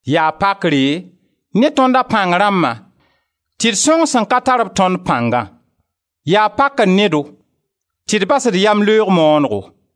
Yaa pakre ne tõnd a pãng rãmbã tɩ d sõng sẽn ka tar b tõnd pãngã; yaa pakr ne-do tɩ d bas d yamleoog maanego.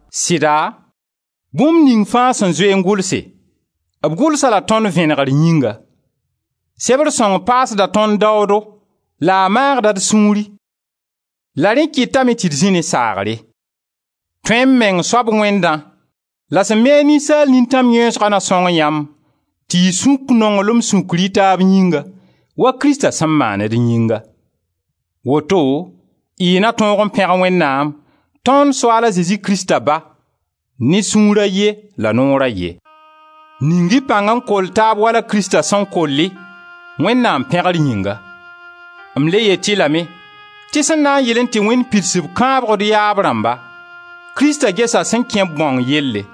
Sɩda, bũmb ning fãa sẽn zoe n gʋlse, b gʋlsa la tõnd vẽnegr yĩnga. Sebr sõng paasda tõnd daoodo la a maagda d sũuri la rẽ kɩtame tɩ d zĩ ne saagre. Tõe-m-meng soab Wẽndã la sẽn mi a ninsaal nintãm yẽesgã na sõng yãmb tɩ y sũk nonglem sũkr y taab yĩnga wa Krista sẽn maan d yĩnga. Woto y na tõog n pẽg Wẽnnaam, tõnd Soaal a Zezi Krista Ba, ne sũur a ye la noor a ye. Ning-y pãng n koll taab wala Krista sẽn koll-y, Wẽnnaam pẽgr yĩnga. M le yet-y lame, tɩ sẽn na n yɩlẽ tɩ Wẽnd pids b sẽn kãab d yaab rãmba, Krista gesa sẽn kẽ-b bãong yelle,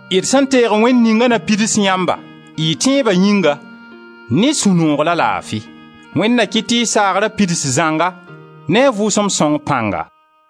D sẽn teeg Wẽnd ninga na pids yãmba, y tẽeba yĩnga, ne sũ-noog la laafi. Wẽnd na kɩt tɩ y saagra pids zãnga ne a Vʋʋsem Sõng pãnga.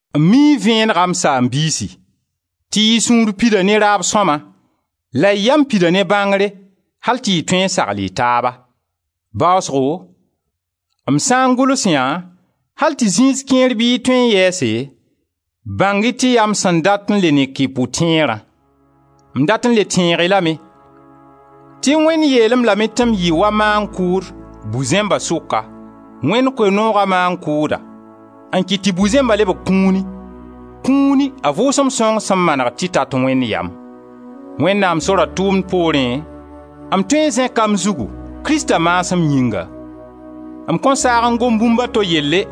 M mii vẽenega, m saam-biisi, tɩ y sũur pida ne raab sõma la y yam pida ne bãngre al tɩ y tõe n sagl y taaba. Baasgo m sã n gʋls yã al tɩ zĩis kẽer bɩ y tõe n yɛɛse, bãng-y tɩ yaa m sẽn dat n le nek y pʋtẽerã. M dat n le tẽeg y lame tɩ Wẽnd yeel-m lame tɩ m yɩ wa maan-kʋʋd bu-zẽmba sʋka, Wẽnd Koe-nooga maan-kʋʋda, n kɩt tɩ bu-zẽmba lebg kũuni, kũuni a Vʋʋsem Sõng sẽn maneg tɩ tat Wẽnd yam. Wẽnnaam sora tʋʋmd poorẽ, m tõe n zẽka m zugu, Krista maasem yĩnga. M kõn saag n gom bũmb a to yelle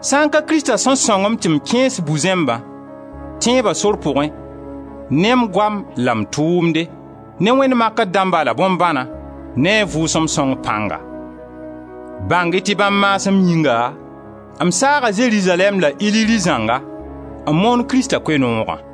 sã n ka Krista sẽn sõng-m tɩ m kẽes bu-zẽmba, tẽeba sor pʋgẽ, ne m goam la m tʋʋmde, ne wẽnd makr dãmba la bõn-bãna, ne a Vʋʋsem Sõng pãnga. Bãng-y tɩ bãmb maasem yĩnga, m saaga Zerizalɛɛm la Illiri zãnga, n moon Krista Koe-noogã.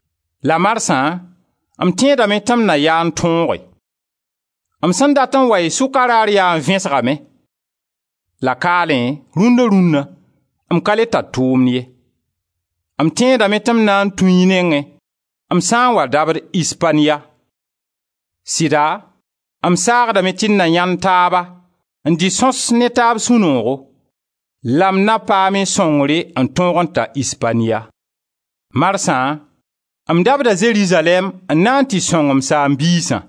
La marsã m tẽedame tɩ m na yaa n tõoge. M sẽn dat n wa y sʋka raar yaa n vẽsgame; la kaalẽ, rũna-rũna, m ka le tar tʋʋmd ye. M tẽedame tɩ m na tũ y nengẽ m sã n wa rabd Ispaniya. Sɩda, m saagdame tɩ d na yãend taaba n dɩ sõs ne taaba sũ-noogo, la m na paam y sõngre n tõog n ta Ispaniya. Marsã m dabda Zerizalɛɛm n na n tɩ sõng m saam-biisã.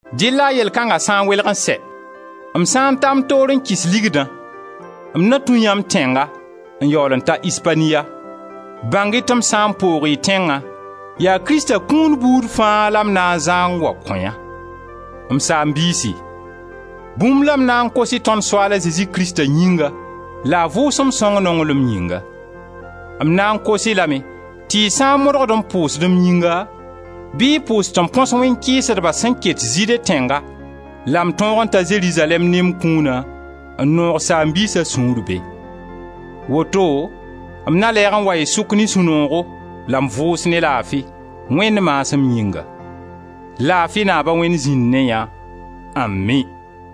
Dɩlla yell kãnga sã n welg n sɛ, m sã n ta m toor n kɩs ligdã, m na tũ yãmb tẽnga n yaool n ta Ispaniya. Bãng-y tɩ m sã n poog y tẽngã, yaa Krista kũun buud fãa la m na n zã n wa kõ yã. M saam-biisi, bũmb la m na n kos-y tõnd Soaal a Zezi Krista yĩnga la a Vʋʋsem Sõng nonglem yĩnga. M na n kos-y lame tɩ y sã n modgd n pʋʋsd m yĩnga, bɩ y pʋʋs tɩ m põs wẽn-kɩɩsdba sẽn ket Zɩɩde tẽnga la m tõog n ta Zerizalɛɛm ne m kũuna n noog saam-biisa sũur be. Woto m na lɛɛg n wa y sʋk ne sũ-noogo la m vʋʋs ne laafi, Wẽnd maasem yĩnga. Laafi Naaba-Wẽnd zĩnd ne yã. Ami!